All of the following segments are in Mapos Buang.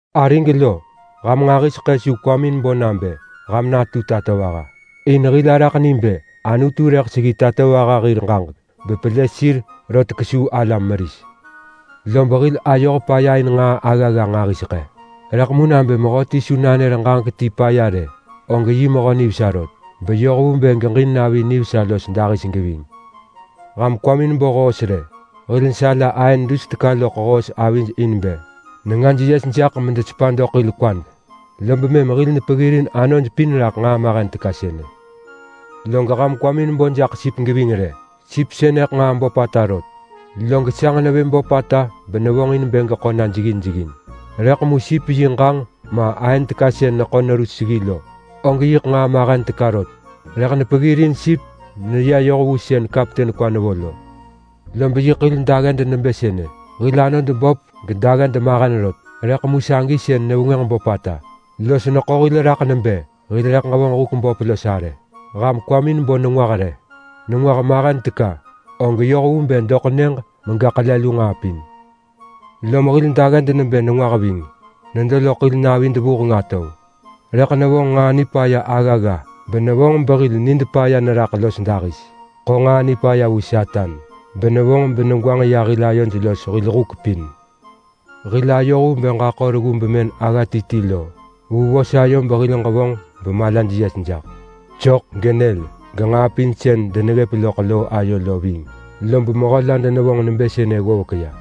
Arig lo, ham nġahiseḳë su kwamin bo nabë ham natu tatovaha, in hil araḳ ni bë Anutu rëḳ seggi tatovaha hir ġaġek bepelë sir rot kesuu alam meris. Lob hil ayoh paya in nġaa aggagga nġahiseḳë, rëḳ mu nabë mehöti su nanër ġaġek ti paya rë, og yi mehö nivesa rot beyoh vu bë geġin navi nivesa los dahis geving. Ham kwamin bo hoos rë! Hil nesala aën dus teka loḳ hoos avij in bë nengaj yes jaḳ medesepa doḳ hil kwad, lob mëm hil nepeggirin anoj pin raḳ nġaa mahen teka sënë. Log ham kwamin bo jaḳ sip geving rë! Sip sënëḳ nġaa böpata rot, log sanġ nevë böpata benevonġin bë geḳo na jeggin jeggin, rëḳ mu sip yi ġanġ ma aën teka sën neḳo neru seggi lo, og yiḳ nġaa mahen teka rot, rëḳ nepeggirin sip meneya yoh vu sën kapten kwa nevo lo. Lob yiḳ hil dagged nebë sënë. Hil anod böp gedagged mahen rot, rëḳ mu sagi sën nevengwënġ böpata los neḳo hil raḳ nebë hil rëḳ ġevonġ huk böp los arë. Ham kwamin bo nengwah rë. Nengwah mahen teka, og yoh vu bë doḳ nyëġ mega ḳele lu nġaa pin. Lom hil dagged nebë nengwah ving. Nedo loḳ hil navid vuheng atov, rëḳ nevonġ nġaa nipaya aggagga benevonġ behil nid paya neraḳ los dahis. Ḳo nġaa nipaya vu Satan benevonġ benegwanġ ya hil ayod los hil huk pin. Hil ayoh vu bë ġaḳo reggu bemën agga ti ti lo vu vos ayo behil ġevonġ bemalaj yes jaḳ. Sok genyël genġaa pin sën deneggëp loḳ loo ayo lo ving. Lob mehö la denevonġ nebë sënë ggovek ya.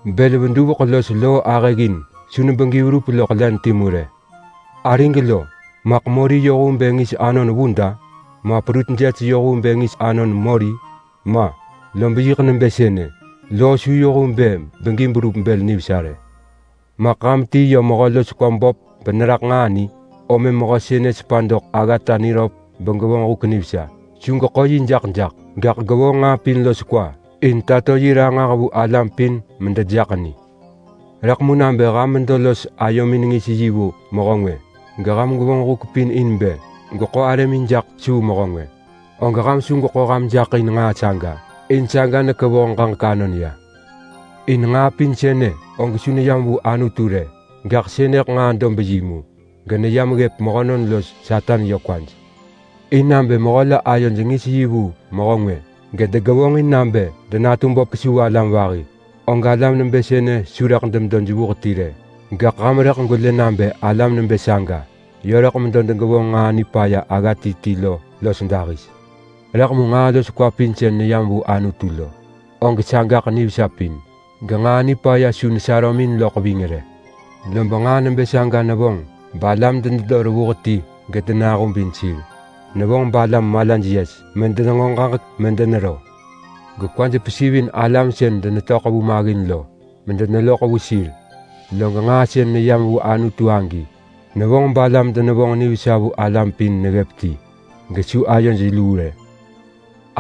Bël veduveḳ los loo ahëggin su nebegi verup loḳ len timu rë. Arig lo! Maḳ mori yoh vu bë ngis anon vud-a? Ma prut jes yoh vu bë ngis anon mori? Ma! Lob yiḳ nebë sënë: Loo su yoh vu bë begi berup bël nivesa rë. Maḳ ham ti yi mehö los kwa böp beneraḳ nġaa ni? Om mëm mehö sënë sepa doḳ aggata niröp begevonġ huk nivesa. Su geḳo yi jaḳ jaḳ, gaḳ gevonġ nġaa pin los kwa in tato yi ranġah vu alam pin medejaḳ ni. Rëḳ mu nabë ham medo los ayomin ngis yi vu mehö ngwë, geham gwevonġ huk pin in bë gweḳo arëmin jaḳ kesuu mehö ngwë, og ham su gweḳo ham jaḳ in nġaa saga in saga nekevoh ġaġek anon ya. In nġaa pin sënë og su neyam vu Anutu rë, gaḳ sënëḳ nġaa dob yi mu geneyam ggëp mehönon los Satan yö kwaj. In nabë mehö la ayoj ngis yi vu mehö ngwë, gedegevonġin nabë denatu böp kesuu alam vahi, og alam nebë sënë su rëḳ demedo jevuh ti rë. Gaḳ ham rëḳ gwelë nabë alam nebë saga yö rëḳ medo degevonġ nġaa nipaya agga ti ti lo los dahis. Rëḳ mu nġaa los kwa pin sën neyam vu Anutu lo, og sagaḳ nivesa pin genġaa nipaya su nesarömin loḳ ving rë. Lob nġaa nebë saga nevonġ balam denedo revuh ti gedenahubin sir. Nevonġ balam malaj yes medenenġo ġaġek medenero gekwaj pesivin alam sën denetöḳ vu maggin lo medeneloḳ vu sir. Log nġaa sën neyam vu Anutu agi nevonġ balam denevonġ nivesa vu alam pin neggëp ti, gesu ayoj luu rë.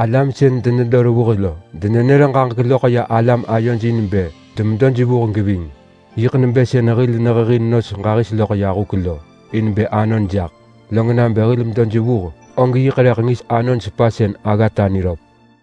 Alam sën denedo revuh lo denenër ġaġek loḳ ya alam ayoj in bë demedo jevuh geving. Yiḳ nebë sën hil nehehin nos ġahis loḳ huk lo in bë anon jaḳ. Log nabë hil medo jevuh og yik rëḳ ngis anon sepasën aggata niröp.